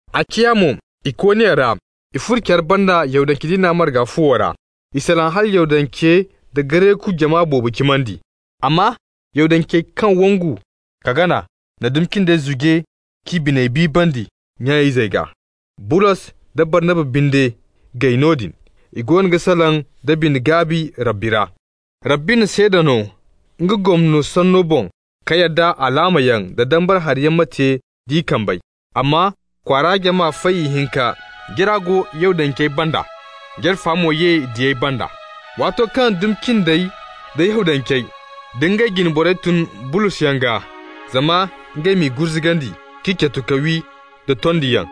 A ciya mo Ikoniya ra i furo care banda Yahudance diina marga fuwo ra. I salaŋ hala Yahudance da Gareku jama boobo cimandi. Amma Yahudancey kaŋ wangu ka gana na dumi cindey zuje k'i biney biibandi nya-izey gaa. Bulos da Barnaba binde gay noodin, i goono ga salaŋ da bine-gaabi Rabbi ra. Rabbi na seeda no nga gomno sanno boŋ ka yadda alaamayaŋ, da dambara hariyaŋ ma te d'i kambey. Amma kwaara jama fay ihinka, jara go Yahudancey banda, jara fo mo ye diyey banda. Waato kaŋ dumi cindey da Yahudancey da ngey jine borey tun Bulosyaŋ gaa zama ngey m'i gurzugandi, k'i catu ka wi da tondiyaŋ,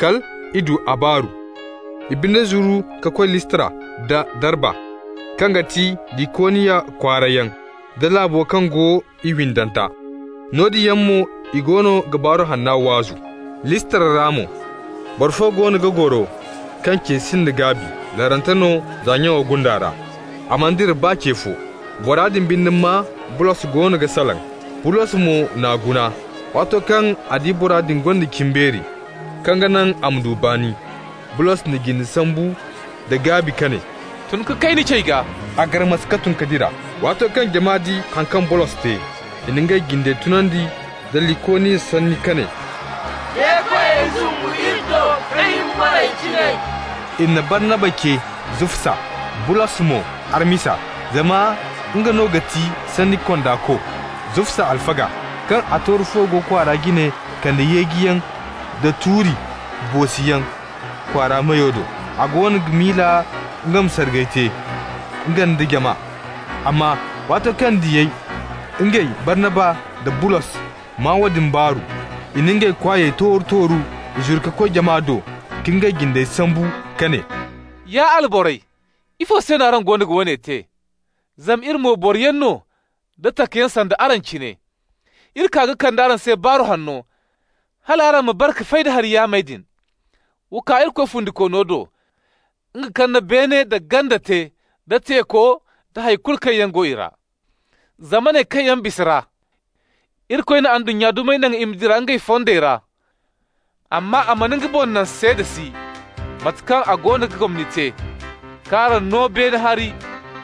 kal i du a baaru. I binde zuru ka koy Listra da Darba, kaŋ ga ti Likoniya kwaarayaŋ, da laabo kaŋ go i windanta. Noodin yaŋ mo i goono ga Baaru Hanna waazu. Listra ra mo, boro fo goono ga goro kaŋ ce sinda gaabi, larante no za nyaŋo gunda ra. A mana dira baa ce fo. Bora din binde maa Bulos goono ga salaŋ. Bulos mo n'a guna. Waato kaŋ a di bora din gonda cimbeeri kaŋ ga naŋ a ma du baani, Bulos na jinde sambu nda gaabi ka ne: «Tun ka kay ni cey gaa.» A garmas ka tun ka dira. Waato kaŋ jama di haŋ kaŋ Bulos te, i na ngey jinde tunandi nda Likoniya sanni ka ne: «De-koyey zumbu iri do ka hima borey cine!» I na Barnaba ce Zufsa, Bulos mo Harmisa, zama nga no ga ti sanni kondako. Zufsa alfaga, kaŋ a tooru fuwo go kwaara jine, kande yeejiyaŋ da tuuri boosiyaŋ kwaara meyo do. A goono ga miila nga ma sargay te, nga nda jama. Amma waato kaŋ diyey, ngey Barnaba da Bulos, maa woodin baaru, i na ngey kwaayey tooru-tooru. I zuru ka koy jama do, ka ngey jindey sambu ka ne: «Ya alborey, ifo se no araŋ goono ga woone te? Zama iri mo boroyaŋ no da takayaŋ sanda araŋ cine. Iri kaa ka kande araŋ se Baaru Hanno, hal araŋ ma bare ka fay da hari yaamey din. Wa kaa Irikoy fundikoono do, nga kaŋ na beene da ganda te, da teeko, da hay kulu kaŋ yaŋ go i ra. Zamaney kaŋ yaŋ bisa ra, Irikoy na ndunnya dumey naŋ i ma dira ngey fondey ra. Amma a mana nga boŋ naŋ seeda si, mate kaŋ a goono ga gomni te, k'araŋ no beene hari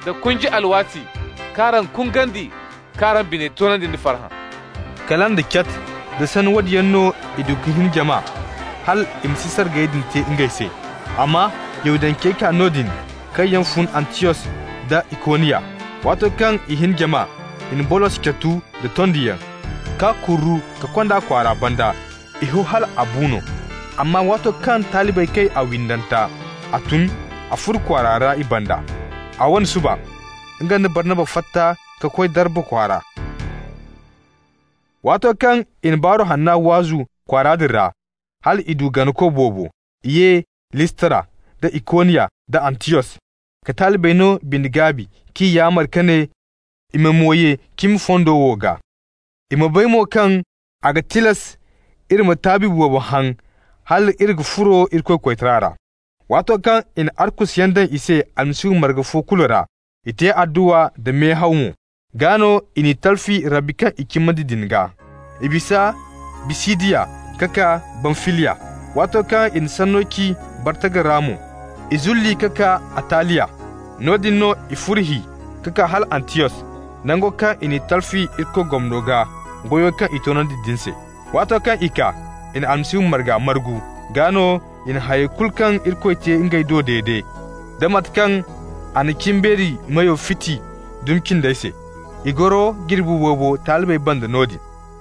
da kunji alwaati, k'araŋ kungandi, k'araŋ biney toonandi da farhã.» Kala nda cat, da sanni woodin yaŋ no i du ka hin jama hal i ma si sargayey din te ngey se. Amma Yahudancey kaa noodin kaŋ yaŋ fun Antiyos da Ikoniya. Waato kaŋ i hin jama, i na Bulos catu da tondiyaŋ, k'a kurru ka kond'a kwaara banda. I ho hal a bu no. Amma waato kaŋ talibey kay a windanta, a tun. A furo kwaara ra i banda. A wane suba, nga nda Barnaba fatta ka koy Darba kwaara. Waato kaŋ i na Baaru Hanna waazu kwaara din ra, hal i du ganako boobo, i ye Listra da Ikoniya da Antiyos, ka talibey no bine-gaabi, k'i yaamar ka ne i ma mo ye cimi fondo wo gaa. I ma bay mo kaŋ a ga tilas iri ma taabi boobo haŋ hal iri ga furo Irikoy koytara ra. Waato kaŋ i na arkusuyaŋ daŋ i se Almasihu marga fo kulu ra, i te adduwa nda mehaw mo, gaa no i n'i talfi Rabbi kaŋ i cimandi din gaa. I bisa Bisidiya ka kaa Bamfiliya. Waato kaŋ i na sanno ci Bargata ra mo, i zulli ka kaa Ataliya. Noodin no i furo hi ka kaa hala Antiyos, nango kaŋ i n'i talfi Irikoy gomno gaa, goyo kaŋ i toonandi din se. Waato kaŋ i kaa, i na Almasihu marga margu. Gaa no i na hay kulu kaŋ Irikoy te ngey do dede, da mate kaŋ a na cimbeeri meyo fiti dumi cindey se. I goro jirbi boobo talibey banda noodin.